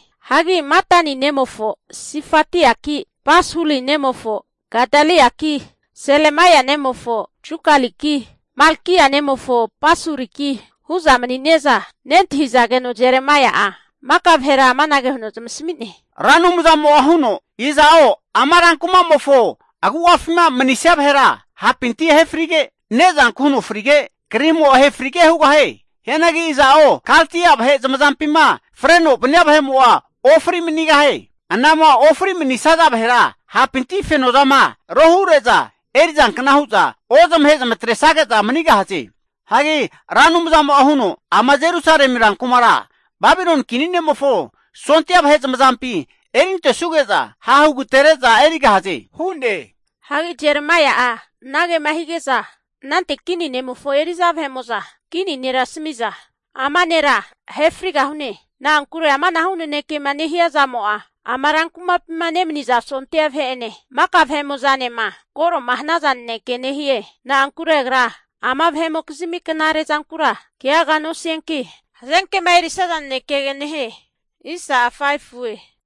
Hagi Matani nemofo Sifatiaki, Pasuri nemofo Gadaliaki, Selemaia nemofo Jukaliki, Malkia nemofo Pasuriki hu'za mani'ne'za nentahizageno Jeremaia'a maka vahera amanage huno zamasami'ne, Ra Anumzamo'a huno, iza'o ama rankuma'mofo agu'afima manisia vahera hapinti ahe frige, ne'zanku huno frige, krimo ahe frige hugahie. Hianagi iza'o Kaldia vahe zamazampima freno vania vahe'mo'a ofri manigahie. Anama ofri manisaza vahera hapinti fenozama rohure'za erizankna hu'za, ozamahe zamatresage'za manigahaze. Hagi Ra Anumzamo'a huno, Ama Jerusalemi rankumara Babiloni kini ne'mofo sondia vahe zamazampi erintesuge'za hahugatere'za erigahaze hu'ne. Hagi Jeremaia'a anagema hige'za anante kini ne'mofo eri'za vahe'mo'za kini nera asami'za, ama nera ahe frigahune. Na'ankure amanahu nanekema nehia zamo'a, ama rankumapima nemaniza sondia vahe'ene maka vahemo'zanema koro'ma hanaza naneke nehie. Na'ankure agra ama vahe'mokizmi knare zankura keaga nosianki, hazenkema erisaza nanekege nehie.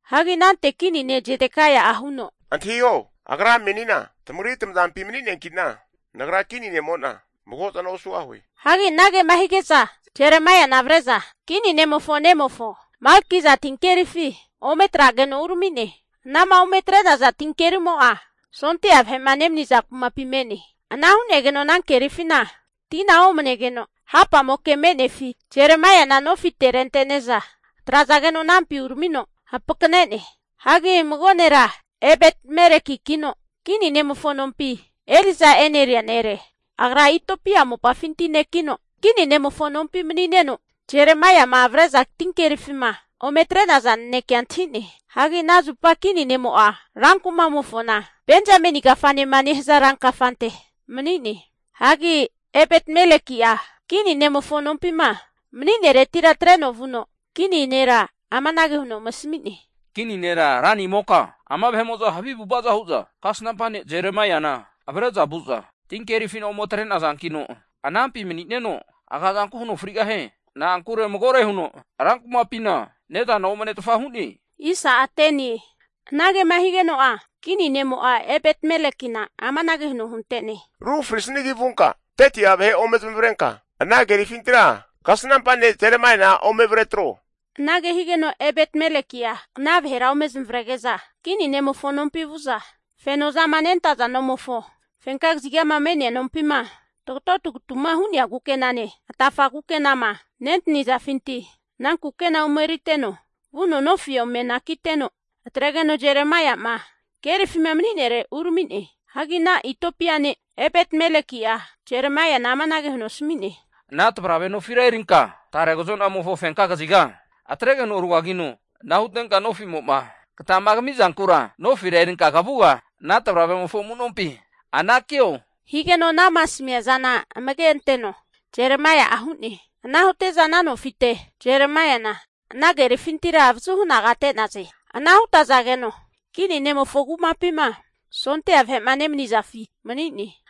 Hagi anante kini ne' Zedekaia'a huno, antahiho! Agra menina tamagri tamazampi mani'neanki'na, nagra kini ne'mo'na mago zana osugahue. Hagi anagema hige'za Jeremaiana avre'za kini ne'mofo nemofo Malkiza tinkerifi ome atrageno urami'ne. Anama ome atre'naza tinkerimo'a sondia vahe'ma nemaniza kumapi me'ne. Ana hu'negeno ana kerifina tina omanegeno hapamoke me'nefi Jeremaiana nofi rentene'za atrazageno anampi uramino hampakane'ne. Hagi mago nera Ebet-Melekikino kini ne'mofo nompi eri'za e'neria nere. Agra Itiopia mopafinti nekino, kini ne'mofo nompi mani'neno, Jeremaiama avre'za tinkerifima ome atre'naza nanekea antahi'ne. Hagi ana zupa kini ne'mo'a rankumamofona Benzameni kafanema nehaza rankafante mani'ne. Hagi Ebet-Meleki'a kini ne'mofo nompima mani'neretira atreno vuno, kini nera amanage huno ome asami'ne. Kini nera ranimoka, ama vahe'mo'za havi avu'avaza hu'za, kasnampa ne' Jeremaiana avre'za vu'za tinkerifina ome atre'nazankino, anampi manineno agazanku huno frigahie. Na'ankure magore huno rankumapina ne'zana omanetfa hu'ne. Anagema higeno'a kini ne'mo'a Ebet-Melekina amanage huno huntene, Ru frisnigi vunka 30'a vahe ome zamavarenka ana kerifintira kasnampa ne' Jeremaiana ome avre atreho. Anage higeno'a Ebet-Meleki'a ana vahera ome zamavarege'za kini ne'mofo nompi vu'za, feno zama nentaza nomofo fenka kazigama me'nea nompima, tagato tagatu'ma hu'nea kukenane atafa kukenama nentazafinti ana kukena ome eriteno vuno nofi ome anakiteno atregeno Jeremaia'ma kerifima mani'nere urami'ne. Hagi ana Itiopia ne' Ebet-Meleki''a Jeremaiana amanage huno asami'ne, Ana tavarave nofi erinka tarega kazo'namofo fenka kaziga atregeno rugagino, ana hutenka nofimo'ma katama kami'zankura nofira erinka kavuga ana tavravemofo amu'nompi anakio. Higeno anama asamia zana amage anteno Jeremaia'a hu'ne. Ana hute'za ana nofite Jeremaiana ana kerifintira avazuhu anagate'naze. Ana hutazageno kini ne'mofo kumapima sondia vahe'ma nemanizafi mani'ne.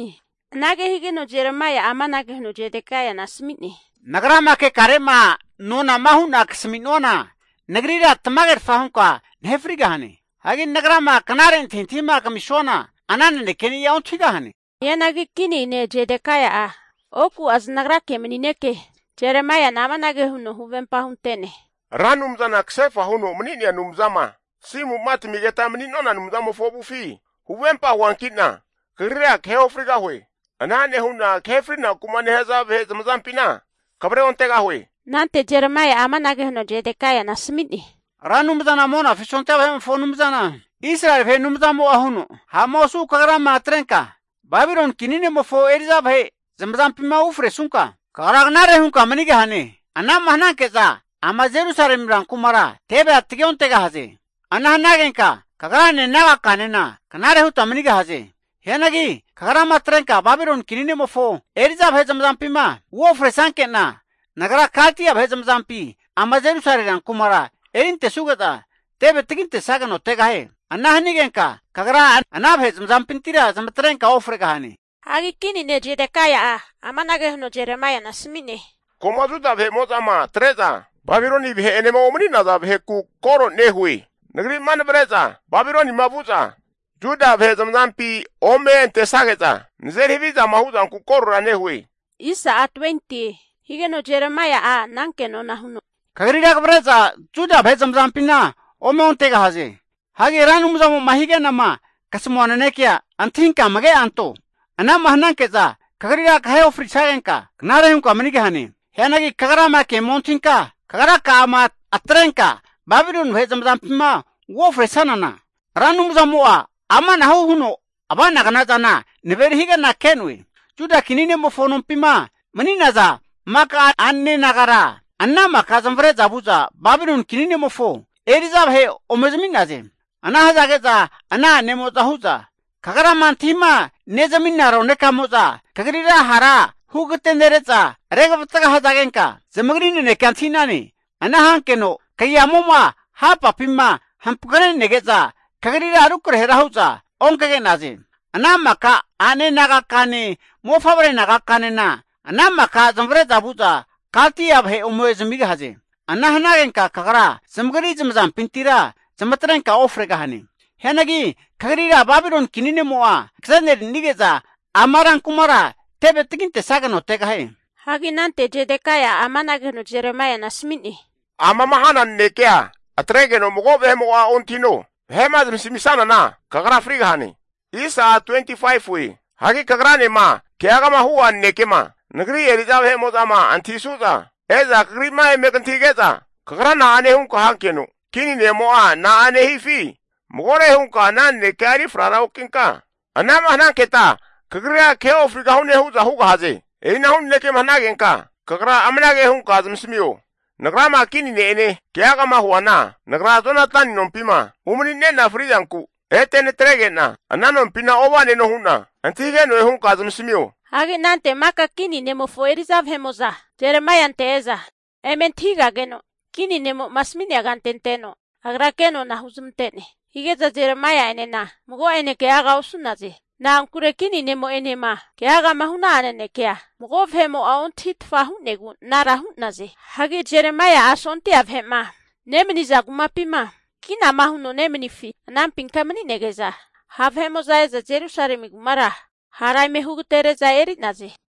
Anage higeno Jeremaia'a amanage huno Zedekaiana asami'ne. Nagrama kekare'ma nonama hu'na kasami'nuana nagrira tamagerfa hunka nahe frigahane. Hagi nagrama knare antahintahima kamisuana, ana nanekeni'a ontahigahane. Hianagi kini ne' Zedekaia'a oku'a zanagrake mani'neke Jeremaiana amanage huno huvempa hunte'ne. Ra Anumzana kasefa huno mani'nea Anumzama, tasimu'ma tamigeta mani'nona Anumzamofo avufi huvempa huanki'na kagrira kahe ofrigahue. Ana nehu'na kahe frinaku'ma nehaza vahe zamazampina kavre ontegahue. Anante Jeremaia'a amanage huno Zedekaiana asami'ne. Ra Anumzana Monafi sondia vahe'mofo Anumzana Israeli vahe Anumzamo'a huno, ha'ma osu kagrama atrenka Babiloni kini ne'mofo eri'za vahe zamazampima ufresunka, kagra knare hunka manigahane. Ana'ma hananke'za ama Jerusalemi rankumara tevea tagi ontegahaze. Ana hanagenka kagrane nagaka'anena knare huta manigahaze. Hianagi kagrama atrenka Babiloni kini ne'mofo eri'za vahe zamazampima uofresanke'na, Nagra Kaldia vahe zamazampi ama Jerusalemi rankumara erintesuge'za teve tagintesageno tegahie. Ana hanigenka kagra ana vahe zamazampintira zamatrenka ofregahane. Hagi kini ne' Zedekaia'a amanage huno Jeremaiana asami'ne. Koma Juda vahe'mo'zama atre'za Babiloni vahe'enema umani'naza vaheku koro nehue. Nagri'ma navre'za Babilonima vu'za Juda vahe zamazampi ome antesage'za, nazeri havizama huzanku korora nehue. Higeno Jeremaia'a ana kenona huno, Kagrira kavre'za Juda vahe zamazampina ome ontegahaze. Hagi Ra Anumzamo'ma hige'nama kasamua nanekea antahinka amage'anto. Ana'ma hananke'za kagrira kahe ofrisagenka knare hunka manigahane. Hianagi kagrama kema ontahinka, kagraka'ama atrenka Babiloni vahe zamazampima uofresanana, Ra Anumzamo'a amanahu huno ava'nagna zana naveri hige'na ke'noe. Juda kini ne'mofo nompima mani'naza maka a'nane nagara, ana maka zamavare'za vu'za Babiloni kini ne'mofo eri'za vahe ome zami'naze. Ana hazage'za ana a'nemo'za hu'za, kagrama antahima nezamina ronekamo'za kagrira hara hugagatenere'za regavatga hazagenka zamagri nanekea antahi'nane. Ana hankeno kagiamo'ma hapapima hampakanege'za, kagrira rukrahera hu'za onkage'naze. Ana maka a'ne naga'kane mofavre nagakanena ana maka zamavare'za vu'za Kaldia vahe ome zamigahaze. Ana hanagenka kagra zamagri zamazampintira zamatrenka ofregahane. Hianagi kagrira Babiloni kini ne'mo'a kaze'nerinige'za ama rankumara teve tagintesageno tegahie. Hagi anante Zedekaia'a amanage huno Jeremaiana asami'ne. Amama hana nanekea atregeno mago vahe'mo'a ontahino. Vahe'ma zamasamisanana kagra frigahane. Hagi kagranema keagama hu'a nanekema nagri eri'za vahe'mo'zama antahisu'za, e'za kagri'ma eme kantahige'za, kagra na'ane hunka hankeno kini ne'mo'a na'ane hifi magore hunka ana nanekea eri frara okinka tasamio. Anama hananketa kagrira kahe ofrigahune hu'za hugahaze. E'inahu nanekema hanagenka kagra amanage hunka zamasamio. Nagrama kini ne'ene keagama huana, nagra Jonatani nompima umanine'na fri'zanku ete natrege'na ana nompina ova'neno hu'na antahige'noe hunka zamasamio. Hagi anante maka kini ne'mofo eri'za vahe'mo'za Jeremaiante e'za eme antahigageno, kini nemo'ma asami'nea kante anteno agra kenona huzmante'ne. Hige'za Jeremaia'enena mago'ene keaga osu'naze. Na'ankure kini nemo'enema keagama hu'na'a nanekea mago vahe'mo'a ontahitfa hu'negu anara hu'naze. Hagi Jeremaia'a sondia vahe'ma nemaniza kumapima kinama huno nemanifi anampinka mani'nege'za, ha' vahe'mo'za e'za Jerusalemi kumara hara eme hugatere'za eri'naze.